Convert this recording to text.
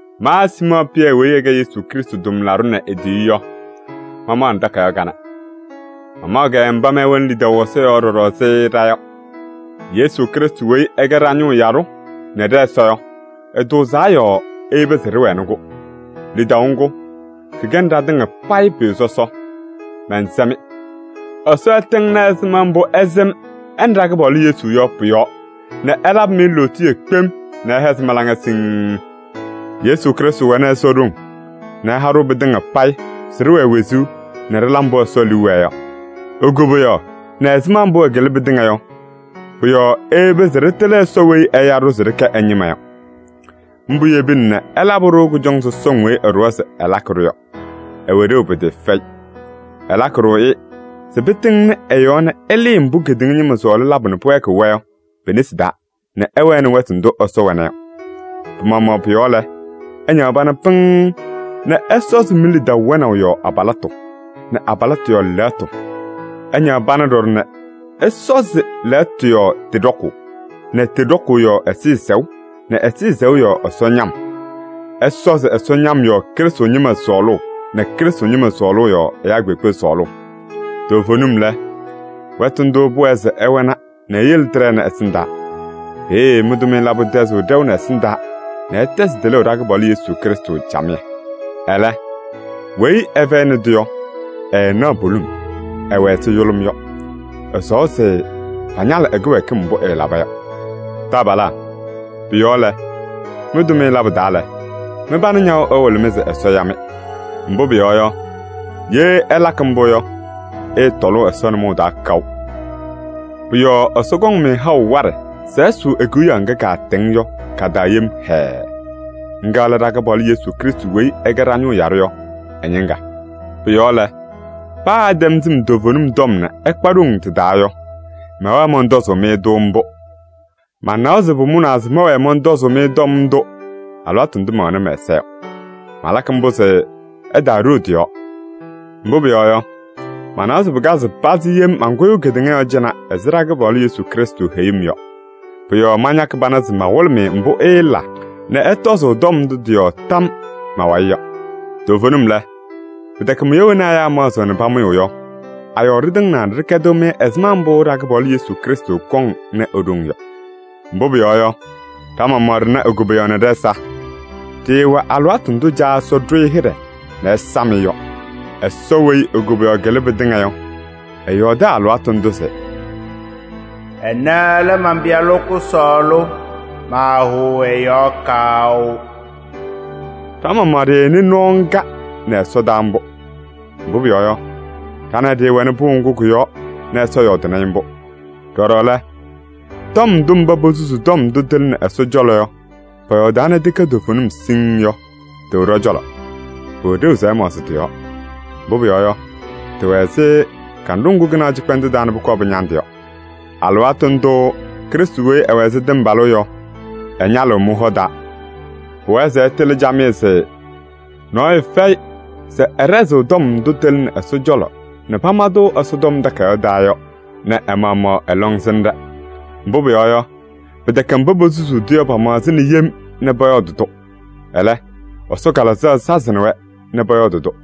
Ma Siimɔɔ Pɩyɛ weyi ɛkɛ Yesu Krɩstʋ tʋmlaɖʋ nɛ e-tiyiyu yɔ, mamaɣnɩ takayaɣ kanɛ. Mamaɣ-kɛ mba mɩ ɩwɛnɩ lidaʋ ɛ-yɔɔ ɖɔɖɔ ɛzɩ ɖa yɔ. Yesu Krɩstʋ weyi ɛkɛ ɖa-ñʋʋ yaɖʋ nɛ ɖɛ-Ɛsɔ yɔ, ɛtʋʋzaa yɔɔ eyebi se ɩwɛnɩ-kʋ. Lidaʋ ŋgʋ, kɩkɛnɩ ɖatɩŋa payɩ pʋyʋ sɔsɔ. Mɛnsɛ-mɩ: Ɛsɔ ɛtɩŋnɩ ɛzɩma mbʋ ɩsɩm ɛ nɛ ɖa-kɩpaɣlʋ Yesu yɔ pʋ-yɔɔ nɛ ɛlabɩ-mɩ lootiye kpem nɛ ɛhɛzɩ mɩ-laŋa siŋŋ. Yesu Krɩstʋ wɛnɩ Ɛsɔ ɖoŋ nɛ ɛha-ɖʋ pɩtɩŋa payɩ se ɖɩwɛɛ wezuu nɛ ɖɩla mbʋ Ɛsɔ liu wɛɛ yɔ. E-koboyaɣ nɛ ɛzɩma mbʋ ɛkɩlɩ pɩtɩŋa yɔ, pɔ-yɔɔ eyebi se ɖɩtɩlɩ Ɛsɔ weyi ɛya-ɖʋ se ɖɩkɛ ɛ-ñɩma yɔ. Mbʋ yebina nɛ ɛlabɩ-ɖʋ kʋjɔŋ sɔsɔŋ weyi ɛɖʋwa se ɛlakɩ-ɖʋ yɔ, ɩwɛ ɖeu pɩtɩɩfɛyɩ. Ɛlakɩ-ɖʋ-ɩ se pɩtɩŋnɩ ɩ-yɔɔ nɛ ɩlɩɩ mbʋ kedeŋa ñɩma sɔɔlɩ labʋ nɛ pɩwɛɛkɩɣ-wɛ yɔ pi-nesi taa nɛ ɩwɛnɩ wɛtʋ ndʋ Ɛsɔ wɛna yɔ. Pɩ-maɣmaɣ pʋ-yɔɔ lɛ, ɩñaɣ pana pɩŋŋ nɛ ɩsɔzɩ mi-lidaʋ wɛnaʋ yɔɔ abalɩtʋ nɛ abalɩtʋ yɔɔ lɛɣtʋ. Ɩñaɣ pana ɖɔɖɔ nɛ ɩsɔzɩ lɛɣtʋ yɔɔ tɩ ɖɔkʋʋ nɛ tɩ ɖɔkʋʋ yɔɔ ɛzɩyɛ sɛʋ nɛ ɛzɩyɛ sɛʋ yɔɔ Ɛsɔ ñam. Ɩsɔzɩ Ɛsɔ ñam yɔɔ Krɩstʋ ñɩma sɔɔlʋʋ nɛ Krɩstʋ ñɩma sɔɔlʋʋ yɔɔ ɛyaa kpeekpe sɔɔlʋʋ. Toovenim lɛ, wɛtʋ ndʋʋ pʋwɛɛ se ɩwɛna nɛ iyele tɩɖɛnɩ ɛsɩndaa. Peeye mɩ-tʋmɩyɛ labʋ tɛzɩɣ ɖɛʋ nɛ ɛsɩndaa nɛ ɩtɛzɩ tɩlʋʋ ɖa-Kɩpaɣlʋ Yesu Krɩstʋ camɩyɛ. Ɛlɛ, weyi ɛfɛyɩnɩ-tʋ yɔ, ɛɛnaɣ poliŋ, ɛwɛ ɛzɩ yʋlʋm yɔ. Ɛsɔwa se pañalɩ ɛ-kɩwɛɛkɩm mbʋ ɛɛlaba yɔ. Taabalaa, pʋ-yɔɔ lɛ, mɩ-tʋmɩyɛ labʋ taa lɛ, mɩ-pana ñaɣʋ ɛwɩlɩ-mɩ se Ɛsɔ ya-mɩ. Mbʋ pʋyɔɔ yɔ, ye ɩlakɩ mbʋ yɔ, ɩɩtɔlʋʋ Ɛsɔ nʋmɔʋ taa kaʋ. Pʋ-yɔɔ Ɛsɔ kɔŋ-mɩ haʋ waɖɛ se ɩsʋʋ e-Kewiyaɣ ŋga kaatɛŋ yɔ ka-taa yem hɛɛɛ. Ŋga lɛ ɖa-Kɩpaɣlʋ Yesu Krɩstʋ weyi ɛkɛ ɖa-ñʋʋ yaɖʋ yɔ ɛ-ñɩŋga. Pʋ-yɔɔ lɛ, paa ɩtɛm sɩm toovenim tɔm nɛ ɩkpa ɖoŋ tɩ-taa yɔ, mɛwɛɣ mɔntɔzʋʋ-mɩ-tʋ mbʋ. Manawa se pʋmʋnaa se mɛwɛɛ mɔntɔzʋʋ-mɩ tɔm ndʋ alɩwaatʋ ndʋ mɛwɛnɩ mɛ-ɛza yɔ. Malakɩ mbʋ se ɩtaaɖoo tɩ-yɔɔ. Mbʋ pʋyɔɔ yɔ, manawa se pɩkazɩ pazɩ yem mankʋyʋʋ kedeŋa yɔɔ cɩnɛ ɛzɩ ɖa-Kɩpaɣlʋ Yesu Krɩstʋ heyuu-m yɔ. Pʋ-yɔɔ mañakɩ pana se mawɩlɩ-mɩ mbʋ ɩɩla nɛ ɩtɔzʋʋ tɔm ndʋ tɩ-yɔɔ tam ma-wayɩ yɔ. Toovenim lɛ, pɩtɛkɛ mʋya wena ɛyaa maɣzɩɣ nɛ pamʋyʋʋ yɔ a-yɔɔ ɖɩtɩŋnaa nɛ ɖɩkɛdɩ-mɩ ɛzɩma mbʋ ɖa-Kɩpaɣlʋ Yesu Krɩstʋ kɔŋ nɛ ɖoŋ yɔ. Mbʋ pʋyɔɔ yɔ, ɖa-maɣmaɣ ɖɩna e-koboyaɣ nɛ ɖɛ-ɛza. Ɖɩɩwɛ alɩwaatʋ ndʋ Caa Ɛsɔ ɖʋ-ɩ hɩɖɛ nɛ ɛsam-ɩ yɔ. Ɛsɔ weyi e-koboyaɣ kɩlɩ pɩtɩŋa yɔ, ɛyɔɔdɩ alɩwaatʋ ndʋ se: “Ɛnɛ lɛ man-Pɩyalʋ kʋsɔɔlʋ, maahʋʋ ɛ-yɔɔ kaʋ.” Ɖa-maɣmaɣ ɖɩnɩ nɔɔ ŋga nɛ ɛsɔdaa mbʋ. Mbʋ pʋyɔɔ yɔ, ɖa nɛ ɩ ɖɩɩwɛnɩ pʋʋ ŋgʋ kʋ-yɔɔ Ɛsɔ yɔɔdɩnɩ-ɩ mbʋ yɔ. Ɖɔɖɔ lɛ, tɔm ndʋ mba posusuu tɔm ndʋ tɩlɩnɩ Ɛsɔ cɔlɔ yɔ pɔyɔɔdaa nɛ tɩkɛ toovenim siŋŋ yɔ, tɩwɛ ɖɔ-cɔlɔ. Pʋwɛ ɖeu se ɩmaɣzɩ tɩ-yɔɔ. Mbʋ pʋyɔɔ yɔ, tɩwɛ ɛzɩ kanɖʋ ŋgʋ kɩnaɣ cɩkpɛndʋʋ taa nɛ pʋkɔɔ pɩñandɩ yɔ. Alɩwaatʋ ndʋʋ Krɩstʋ weyi ɛwɛ ɛzɩ tɩmbalʋʋ yɔ, ɛñalɩɣ mɩ-hɔ taa. Pʋwɛɛ se ɩtɩlɩ camɩyɛ se: nɔɔyʋ fɛyɩ se ɛɖɛzɩɣ tɔm ndʋ tɩlɩnɩ Ɛsɔ cɔlɔ nɛ pama-tʋ Ɛsɔtɔm Takayaɣ taa yɔ nɛ ɛ-maɣmaɣ ɛ-lɔŋsɩnɖɛ. Mbʋ pʋyɔɔ yɔ, pɩtɛkɛ mba posusuu-tʋ yɔ pamaɣzɩna yem nɛ pɔyɔɔdɩ-tʋ. Ɛlɛ, Ɛsɔ Kalɩzaɣ sazɩnɩ-wɛ nɛ pɔyɔɔdɩ-tʋ.